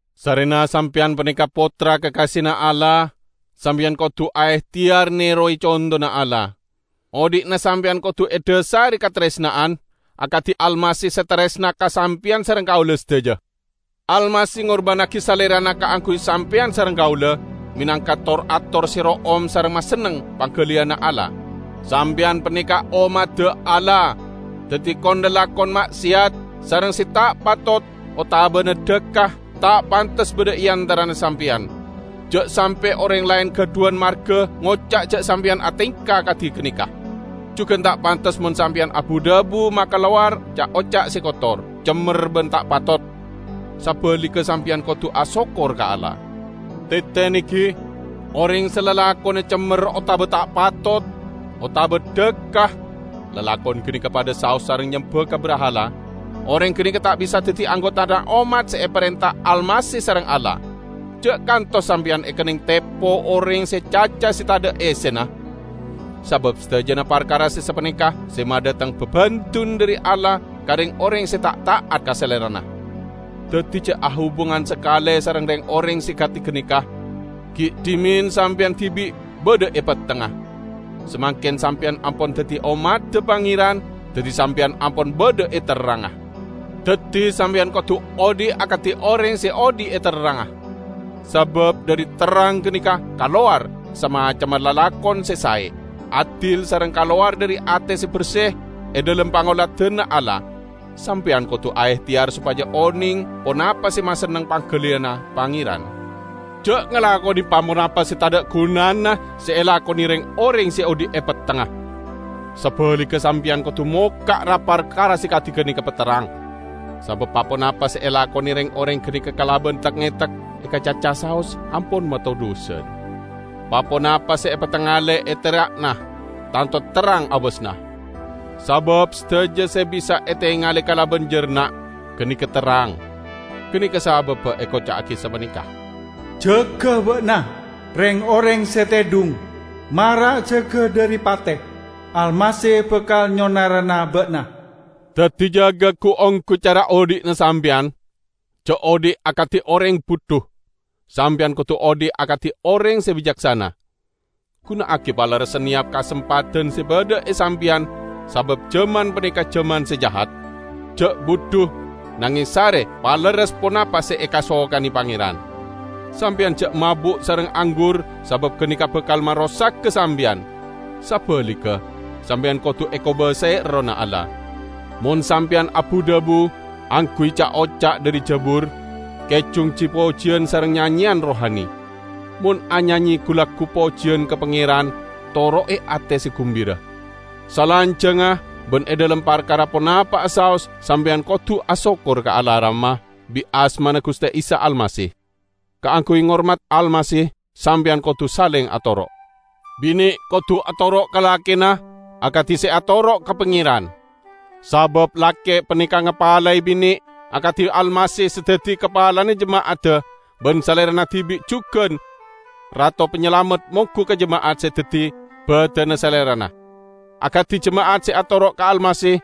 Sarrena sampeyan paneka pottra kakasena Allah, sampeyan kodu aehteyar nerowe contona Allah. Odhi'na sampeyan kodu edhasare kataresna'an, akadi Almasih se taresna ka sampeyan sareng kaula sadaja. Almasih ngorbannagi Salerana kaangguy sampeyan sareng kaula, menangka tor-ator se ro'om sareng masenneng panggaliyanna Allah. Sampeyan paneka ommadda Allah. Daddi, kon-lalakon ma'seyat, sareng se ta' patot, otabana dhakka, ta' pantes badha e antarana sampeyan. Ja' sampe' oreng laen gadhuwan marga ngoca' ja' sampeyan atengka kadi ganeka. Jugan ta' pantes mon sampeyan abu-dhabu makalowar ca'-oca' se kotor, cemmer ban ta' patot. Sabaligga sampeyan kodu asokkor ka Allah. Tetene, gi: Oreng se lalakonna cemmer otaba ta' patot, otaba dhakka, (lalakon ganeka padha saos sareng nyemba ka brahala), oreng ganeka ta' bisa daddi anggotana ommat se eparenta Almasih sareng Allah. Ja' kantos sampeyan ekenneng tepo oreng sareng caca se tadha' essena. Sabab sadajana parkara se sapaneka se madhateng babendun dhari Allah ka reng-oreng se ta' ta'at ka Salerana. Daddi ja' ahubungan sakale sareng reng-oreng se kadi ganeka. Gi' dhimen sampeyan dibi' badha e pettengnga. Samangken sampeyan ampon daddi ommadda Pangeran, daddi sampeyan ampon badha e terrangnga. Daddi, sampeyan kodu odhi' akadi oreng se odhi' e terrangnga. Sabab dhari terrang ganeka kalowar samacemma lalakon se sae, adil sareng kalowar dhari ate se berse e dhalem pangoladanna Allah. Sampeyan kodu aehteyar sopaja oneng ponapa se masenneng panggaliyanna Pangeran. Ja' ngalakone pa-ponapa se tadha' gunana se elakone reng-oreng se odhi' e pettengnga. Sabaligga sampeyan kodu mokka' ra-parkara se kadi ganeka paterrang. ( Sabab pa-ponapa se elakone reng-oreng ganeka kalaban tek-ngetek, ekacaca saos ampon matodhusan.) Pa-ponapa se epatangale e tera'na, tanto terrang abasanna. Sabab sadaja se bisa etengale kalaban jarna', ganeka terrang. Ganeka sababba ekoca'agi sapaneka, "Jaga ba'na, reng-oreng se tedhung, mara jaga dhari pate! Almasih bakal nyonarana ba'na." Daddi jaga gu-onggu cara odhi'na sampeyan. Ja' odhi' akadi oreng budhu; sampeyan kodu odhi' akadi oreng se bicaksana. Guna'agi palerres saneyap kasempadan se badha e sampeyan, sabab jaman paneka jaman se jahat. Ja' budhu, nangeng sare palerres ponapa se ekasokane Pangeran. Sampeyan ja' mabu' sareng anggur, sabab ganeka bakal marosaga sampeyan. Sabaligga, sampeyan kodu ekobasae Errohna Allah. Mon sampeyan abu-dhabu, angguy ca'-oca' dhari jabur, kejung ji-pojiyan sareng nyanyeyan rohani. Mon anyanye gu-laggu pojiyan ka Pangeran, toro'e ate se gumbira. Salanjangnga ban e dhalem parkara ponapa'a saos sampeyan kodu asokkor ka Allah Rama, bit asmana Guste Isa Almasih. Kaangguy ngormat Almasih, sampeyan kodu saleng atoro'. Bine kodu atoro' ka lakena akadi se atoro' ka Pangeran. Sabab lake paneka ngapalae bine, akadi Almasih se daddi kapalana jema'adda, ban Salerana dibi' jugan Rato Panyalamet monggu ka jema'at se daddi badanna Salerana. Akadi jema'at se atoro' ka Almasih,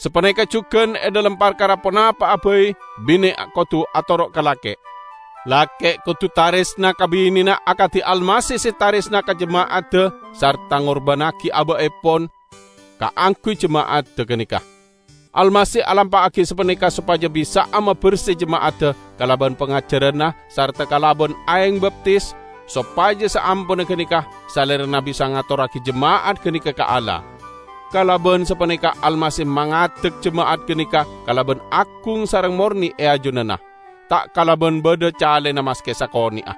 sapaneka jugan e dhalem parkara ponapa'a bai bine kodu atoro' ka lake. Lake kodu taresna ka binena akadi Almasih se taresna ka jema'adda sarta ngorbannagi aba'epon kaangguy jema'adda ganeka. Almasih alampa'agi sapaneka sopaja bisa'a maberse jema'adda kalaban pangajaranna sarta kalaban aeng baptis, sopaja saamponna ganeka Salerana bisa ngatorragi jema'at ganeka ka Allah. Kalaban sapaneka Almasih mangadek jema'at ganeka kalaban agung sareng morne e ajunanna, ta' kalaban badha calena maske sakone'a.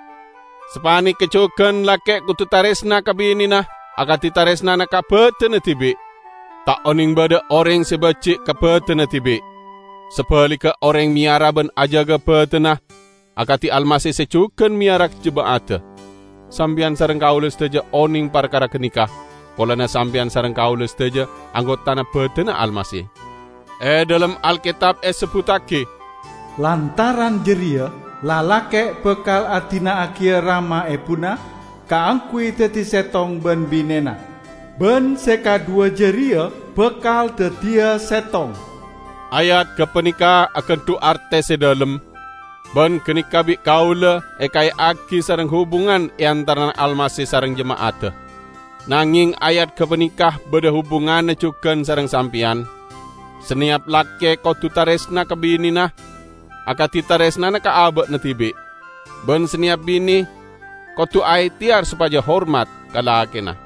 Sapaneka jugan lake kodu taresna ka binena akadi taresnana ka badanna dibi'. ( Ta' oneng badha oreng se baji' ka badanna dibi'. Sabaligga, oreng meyara ban ajaga badanna akadi Almasih se jugan meyara jema'adda. Sampeyan sareng kaula sadaja oneng parkara ganeka, polana sampeyan sareng kaula sadaja anggotana badanna Almasih.) E dhalem Alketab esebbuttagi, "Lantaran jareya lalake' bakal adina'agiya rama ebuna kaangguy daddi settong ban binena, ban se kadhuwa jareya bakal daddiya settong." Ayat gapaneka agandhu' arte se dhalem. Ban ganeka bi' kaula ekae'agi sareng hubungan e antarana Almasih sareng jema'adda. Nangeng ayat gapaneka badha hubunganna jugan sareng sampeyan: saneyap lake kodu taresna ka binena akadi taresnana ka aba'na dibi', ban saneyap bine kodu aehteyar sopaja hormat ka lakena.